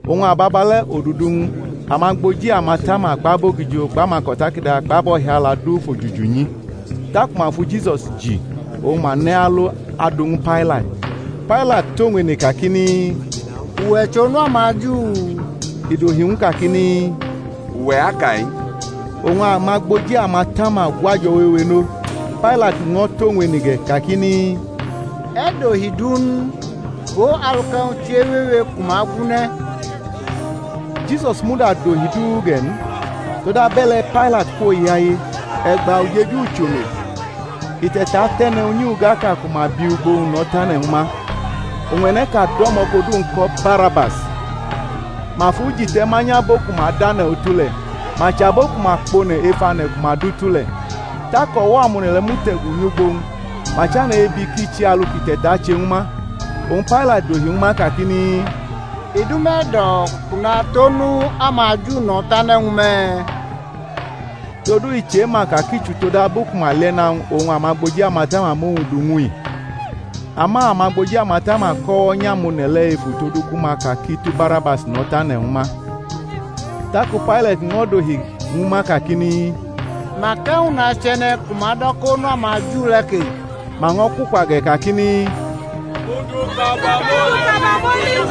Oñ ababale̩ odudu-wñ amagboji amatama kpʼabogijo kpʼamako̩takada kpʼabo̩hiala du fʼojuju nyi; taku ma fu Jisus ji, oñ ma nʼe̩ alo adʼu ñwu Pailat. Pailat tʼowñ ene kakini, Uwe̩ chʼOnu amaJu? I dohi ñw u kakini, Uwe̩ aka-i. Oñ amagboji amatama gwʼajo̩ wewe nʼo. Pailat ño̩ tʼowñ ene ge̩, kakini, E̩ dohi du n? Go alu kʼe̩wñ chewewe ku ma gwunʼe̩. Jisus muda dohi du ge̩ n; Todabe̩le̩ Pailat kwoyaye. E̩gba ujeju-ucholo i te̩tatʼe̩ne̩ unyi-ugaʼka ku ma bi ugbo-wñ no̩ tane̩ ñwu ma. Oñ e̩ne̩ʼka do̩mo̩ kʼodu-wñ ko̩ Barabas, ma fʼu ji te̩ manyʼabo ku ma dʼane̩ utu le̩, ma chʼabo ku ma kpone̩ ef ane̩ ku ma dutu le̩. Tak o̩wo̩ amone̩ le̩ mute̩gu nyʼugbo-wñ, ma chane̩ ebi kʼi che alu kʼi te̩tache ñwu ma. Oñ Pailat dohi ñwu ma kakini, I dʼume̩ e̩do̩ kʼu natʼOnu amaJu no̩ tane̩ ñwu me̩? Todu i chema ka kʼi chʼutodabu ku ma lie̩na-wñ oñ amagboji amatama mʼowñ du ñw u i. Ama amagboji amatama ko̩nyʼo̩wo̩ amone̩ le̩ efu todu ku ma ka kʼi tu Barabas no̩ tane̩ ñwu ma. Taku Pailat ño̩ dohi ñwu ma kakini, Mak e̩wñ nache e̩ne̩ ku me̩ do̩ kʼOnu amaJu le̩ ke? Ma ño̩ kwukwa ge̩ kakini, Mʼu du kabamoli.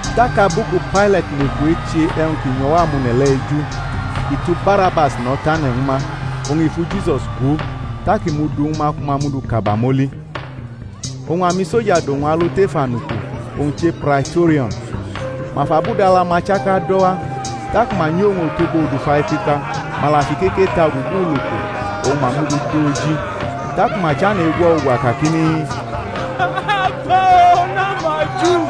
Tak abu ku Pailat neku eche e̩wñ ki nyʼo̩wo̩ amone̩ le̩ eju, i tu Barabas no̩ tane̩ ñwu ma, oñ i fu Jisus gwo, tak i mʼu du ñwu ma ku ma mʼu du kabamoli. Oñ amisoja dʼowñ alo tef anuku, owñ che Praitorio̩n; ma fʼabudala-ma chaka do̩ wa. Taku ma nyi owñ otogbo odufa ekpikpa, ma la fʼikeke ta ugugu uloko, oñ ma mʼu du dʼo oji. Taku ma chane̩ egwʼo̩ ugwa kakini, Agba-o, Onu amaJu!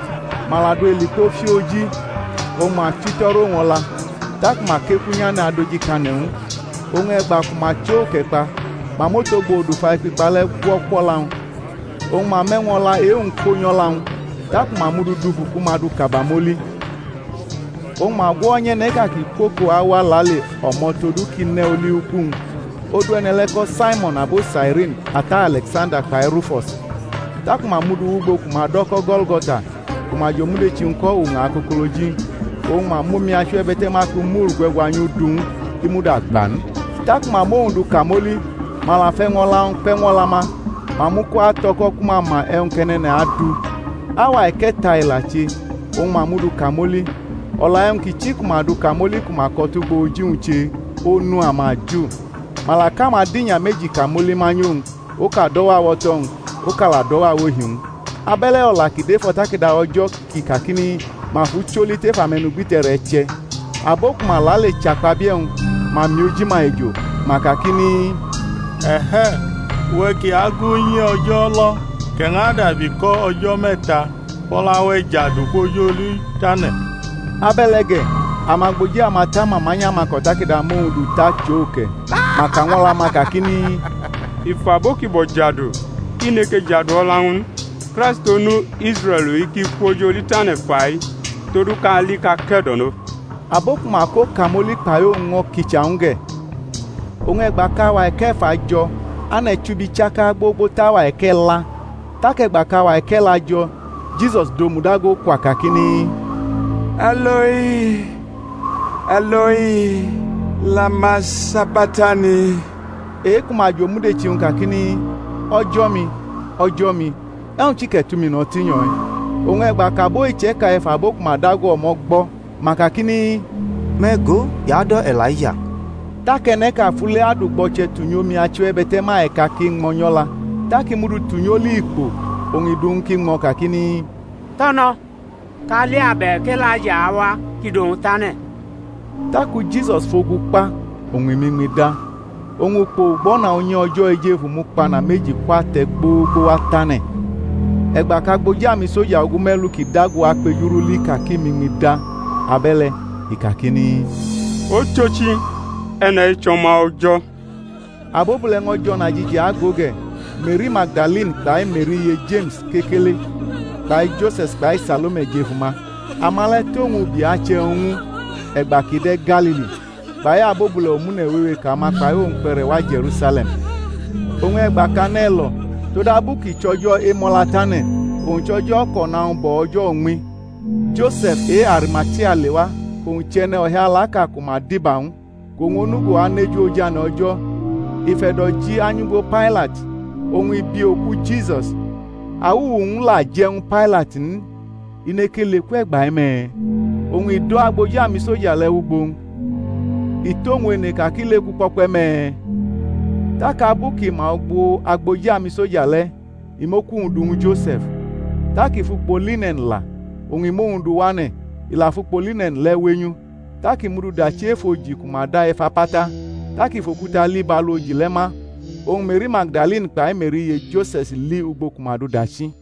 Ma la du elikpo fiʼo̩ oji, oñ ma fito̩rʼowñ o̩la, taku ma kekunyane̩ adojikane̩ ñw u. Oñ e̩gba ku ma chʼo uke̩ kpa, ma mʼotogbo odufa ekpikpa le̩ gwo̩ kwʼo̩la-wñ, oñ ma mʼe̩wñ o̩la e-wñ ko nyʼo̩la-wñ. Taku ma mʼu du dufu ku ma dʼu kabamoli. Oñ ma gwo̩nyʼe̩ne̩ʼka kʼi kwʼoko awa lale o̩mo̩ todu kʼi ne̩ oli uku-wñ. Odu e̩ne̩ le̩ ko Saimo̩n, abo Sairini, ata Ale̩ksanda kpai Rufo̩s. Taku ma mʼu du wʼugbo ku ma do̩ ko̩ Go̩lgo̩ta, ku ma jʼomudechi-wñ ko̩ Uña Akokoloji. Oñ ma mʼomi achiwebe̩te̩ma ku mur gwe̩gwanyʼu du ñw u, i muda gba n. Taku ma mʼowñ du kamoli; ma la fʼe̩wñ o̩la-wñ kpe̩ ñw o̩la-ma, ma mʼu ko ato̩ko̩ ku ma ma e̩wñ kʼe̩ne̩ne̩ne̩ne̩ adu. Auwa e̩ke̩ta i la che, oñ ma mʼu du kamoli. O̩la e̩wñ ki chi ku ma dʼu kamoli ku ma ko̩ tʼugbo oji-wñ che, ONU AMAJU. Ma la kʼamadinya meji kamoli manyʼowñ, oka dʼo̩wo̩ awoto-wñ, oka la dʼo̩wo̩ awohi-wñ. [ Abe̩le̩ o̩la ki dʼef o̩takada O̩jo̩ kʼi kakini, Ma fʼu choli tʼef ame̩nugbite̩re̩ che̩.] Abo ku ma lale chʼakpabie̩-wñ, ma mi oji-ma ejo, ma kakini, E̩he̩! Uwe̩ ki agu unyi O̩jo̩ lo̩ kʼe̩ ñʼadabi ko̩ o̩jo̩ me̩ta, fʼo̩la-we̩ jadu, kwʼoj oli tane̩! Abe̩le̩ ge̩, amagboji amatama manyʼamako̩takada mʼowñ du tʼachʼo uke̩, ma ka ñw o̩la-ma kakini, I fʼabo ki bo̩ jadu, i neke jadu o̩la-wñ n. Kraist Onu Israe̩l-i ki kwʼoj oli tane̩ fa-i, todu kʼa li kʼa ke̩do̩no. Abo ku ma ko kamoli kpai owñ ño̩ kicha ñw u ge̩. Oñ e̩gba kʼauwa e̩ke̩fa jo̩, ane̩ chubi chaka gbogbo tʼauwa e̩ke̩la. Tak e̩gba kʼauwa e̩ke̩la jo̩, Jisus dʼomu dago kwa, kakini, E̩loi, E̩loi, lama sabaktani? e-ku ma jʼomudechi-wñ kakini, O̩jo̩-mi, O̩jo̩-mi, e̩wñ chi kʼe̩ tʼumi no̩ tinyo̩-i? Oñ e̩gba kʼabo iche̩ka efabo ku ma dago o̩mo̩ gbʼo̩, ma kakini, Me̩ go, i ado̩ E̩laija. Tak e̩ne̩ʼka fule adʼugbo̩che̩ tunyʼomi achiwebe̩te̩ma e̩ka ki ñmo̩ nyʼo̩la, tak i mudu tunyʼoli ikpo, oñ i dʼu ñw u kʼi ñmo̩ kakini, To̩no̩, kʼa li abe̩k E̩laija awa kʼi dʼowñ tane̩. Taku Jisus fʼogu kpa, oñ i mʼiñmi da. Oñ ukpo ugbo̩na unyi O̩jo̩ ejefu mukpana meji kwʼate̩ gbogbowa tʼane̩. E̩gba kʼagboji amisoja ogume̩lu kʼi dago akpejurʼu li ka kʼi mʼiñmi da abe̩le̩, i kakini, Ochochi, e̩ne̩-i chʼO̩ma O̩jo̩. Abobule̩ ño̩ jʼo̩najiji ago ge̩; Me̩ri Magdalini kpai Me̩ri iye Jeme̩s kekele kpai Jose̩s kpai Salome jʼef uma, ama le̩ tʼowñ ubi achʼe̩wñ ñw u, e̩gba kʼi de̩ Galili; kpai abobule̩ omune̩ wewe kʼama kpai owñ kpe̩re̩ wa Je̩rusale̩m. Oñ e̩gba kʼane̩ lo̩, todabu kʼi chʼO̩jo̩ Emo̩latane̩, owñ chʼo̩jo̩ kʼo̩na-wñ bo̩ o̩jo̩ uñmi, Jose̩f e-Arimatia lewa, kʼowñ chʼe̩ne̩ o̩hialaʼka ku ma diba ñw u, kʼowñ onugo aneju ojane̩ O̩jo̩; i fʼe̩do̩ ji anyʼugbo Pailat, oñ i bi oku Jisus. Awuwu-wñ la je̩ ñwu Pailat n, i neke leku e̩gba-i me̩? oñ i do̩ agboji amisoja le̩ wʼugbo-wñ, i tʼowñ ene ka kʼi leku kpo̩kpe̩ me̩? Tak abu kʼi ma ugbo agboji amisoja le̩, i mʼoku-wñ du ñwu Jose̩f. Tak i fʼukpo line̩n la, oñ i mʼowñ du wane̩, i la fʼukpo line̩n le̩ wenyʼu, tak i mʼu du dachi ef oji ku ma da ef apata; tak i fʼokuta li bʼalu oji le̩ ma. Oñ Me̩ri Magdalini kpai Me̩ri iye Jose̩s li ugbo ku ma dʼu dachi.